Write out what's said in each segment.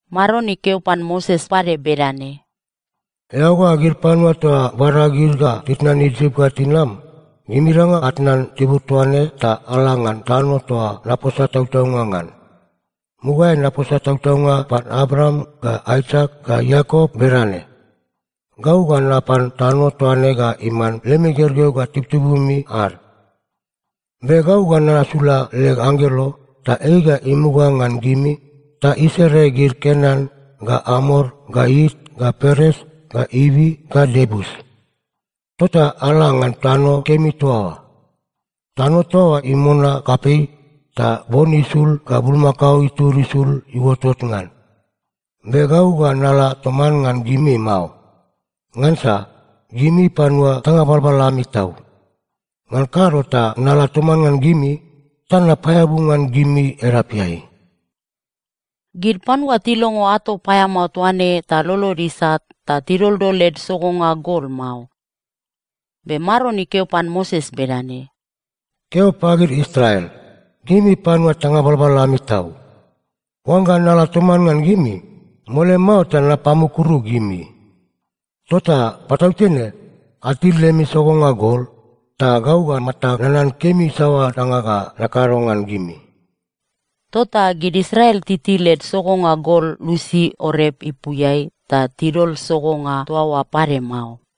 Maron ikeo pan Moses pade bedane, “Eao ga gid panua toa bada gid ga titnan Isip ga tinam, gimingada atnan tibur toa ne ta ala ngan tano toa naposa tautaunga ngan. Mugaeai naposa tautaunga pan Abraam ga Aisak ga Iakop bedane, ‘Gau ga napan tano toa ne ga iman lemi gergeu ga tibutibumi ad.’ Be gau ga nasula leg anggelo, ta ei ga imuga ngan gimi ta isere gid Kenan ga Amor ga It ga Peres ga Ivi ga Iebus. Tota ala ngan tano kemi toa oa. Tano toa oa imona kapei ta bon isul ga bulmakao itud isul iuotot ngan. Be gau ga nala toman ngan gimi mao. Ngansa gimi panua tanga balbal ami tau. Ngan kado ta nala toman ngan gimi, ta napaeabu ngan gimi edapeai.” Gid panua tilongo ato paeamao toa ne ta lolod isat ta tidoldol led sogonga gol mao. Be Maron ikeo pan Moses bedane, “Keo pagid Israel, ‘Gimi panua tanga balbal ami tau. Oangga nala toman ngan gimi, mole mao ta napamukuru gimi. Tota patautene atil lemi sogonga gol, ta gau ga matag nanan kemi saoa danga ga nakado ngan gimi.’” Tota gid Israel titil led sogonga gol lusi Orep ipuiai ta tidol sogonga toa oa pade mao.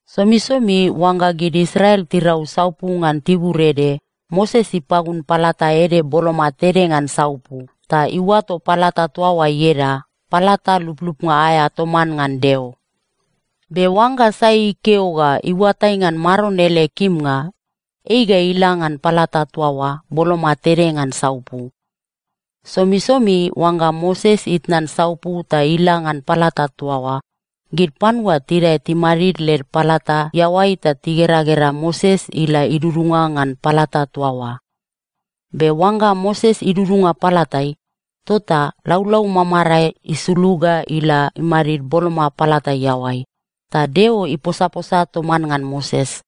Somisomi oangga gid Israel tirau saupu ngan tibur ede, Moses ipagun palata ede boloma tede ngan saupu, ta iuato palata toa oa ieda “Palata Luplupnga aea toman ngan Deo.” Be oangga sai ikeo ga iuatai ngan Maron ele kimnga, ei ga ila ngan palata toa oa boloma tede ngan saupu. Somisomi oangga Moses itnan saupu ta ila ngan palata toa oa, gid panua tidae timadid led palata iaoai ta tigeragera Moses ila idudunga ngan palata toa oa. Be oangga Moses idudunga palatai, tota laulau mamarae isulug ga ila imadid boloma palata iaoai, ta Deo iposaposa toman ngan Moses.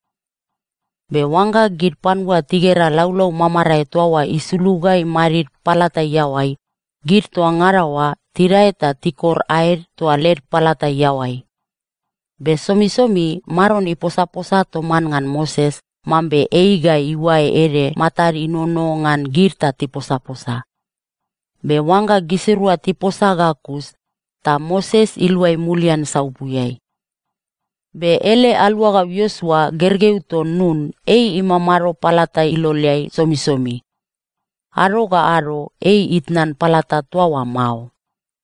Be oangga gid panua tigera laulau mamarae toa oa isulug ga imadid palata iaoai, gid toa ngada oa tidae ta tikor aed toa led palata iaoai. Be somisomi Maron iposaposa toman ngan Moses mambe ei ga iuae ede matad inono ngan gid ta tiposaposa. Be oangga gisirua tiposa ga kus, ta Moses iluai mulian saupuiai. Be ele aluagau Iosua, gergeu ton Nun, ei imamado palata iloleai somisomi. Ado ga ado ei itnan palata toa oa mao.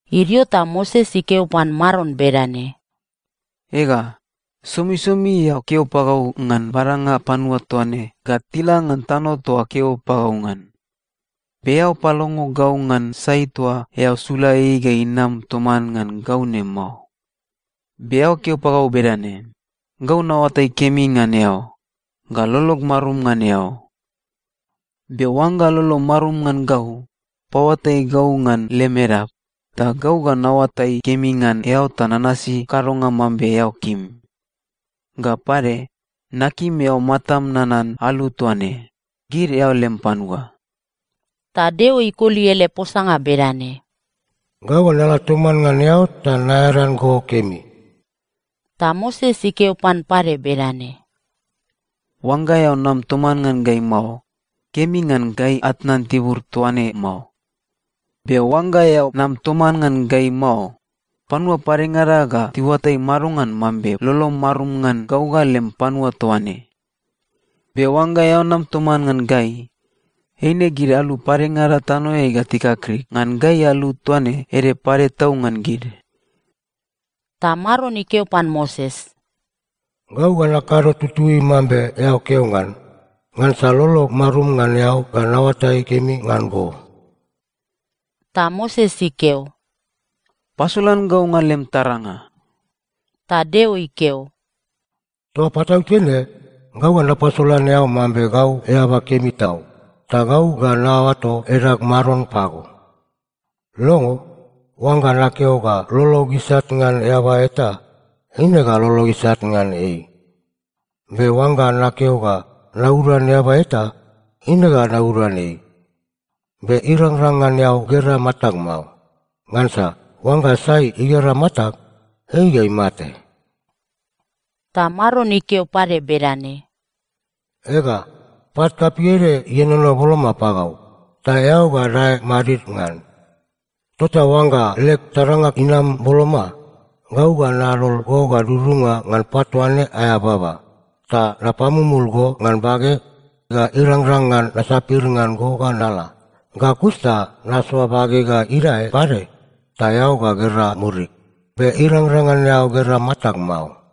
Idio ta Moses ikeo pan Maron bedane, “Ega, somisomi eao keo pagau ngan badanga panua toa ne ga tila ngan tano toa keo pagau ngan, be eao palongo gau ngan sai toa eao sula ei ga inam toman ngan gau ne mao. Be eao keo pagau bedane, ‘Gau naoatai kemi ngan eao, ga lolog marum ngan eao.’ Be oangga lolom marum ngan gau, paoatai gau ngan lem edap, ta gau ga naoatai kemi ngan eao ta nanasi kadonga mambe eao kim. Ga pade, nakim eao matam nanan alu toa ne, gid eao lem panua.” Ta Deo ikoli ele posanga bedane, “Gau ga nala toman ngan eao ta naearan go kemi.” Ta Moses ikeo pan pade bedane, “Oangga eao nam toman ngan gai mao, kemi ngan gai atnan tibur toa ne mao. Be oangga eao nam toman ngan gai mao, panua padengada ga tiuatai madongan mambe lolom marum ngan gau ga lem panua toa ne? Be oangga eao nam toman ngan gai, eine gid alu padengada tanoeai ga tikakrik ngan gai alu toa ne ede pade tau ngan gid.” Ta Maron ikeo pan Moses, “Gau ga nakado tutui mambe eao keo ngan, ngansa lolog marum ngan eao ga naoatai kemi ngan go.” Ta Moses ikeo, “Pasolan gau ngan lem taranga.” Ta Deo ikeo, “Toa patautene gau ga napasolan eao mambe gau eaba kemi tau, ta gau ga naoato edag Maron pago. Longo. Oangga nakeo ga lolog isat ngan eaba eta, eine ga lolog isat ngan ei. Be oangga nakeo ga nauduan eaba eta, eine ga nauduan ei. Be irangrang ngan eao gera matag mao. Ngansa oangga sai igera matag, ei ga imate.” Ta Maron ikeo pade bedane, “Ega, pat kapei ede ienono boloma pagau. Ta eao ga dae madid ngan. Tota oangga leg taranga inam boloma, gau ga nadol go ga dudunga ngan pat toa ne aea baba, ta napamumul go ngan bageg ga irangrang ngan nasapir ngan go ga nala. Ga kus ta nasoa bageg ga idae pade, ta eao ga gera murig. Be irangrang ngan eao gera matag mao.”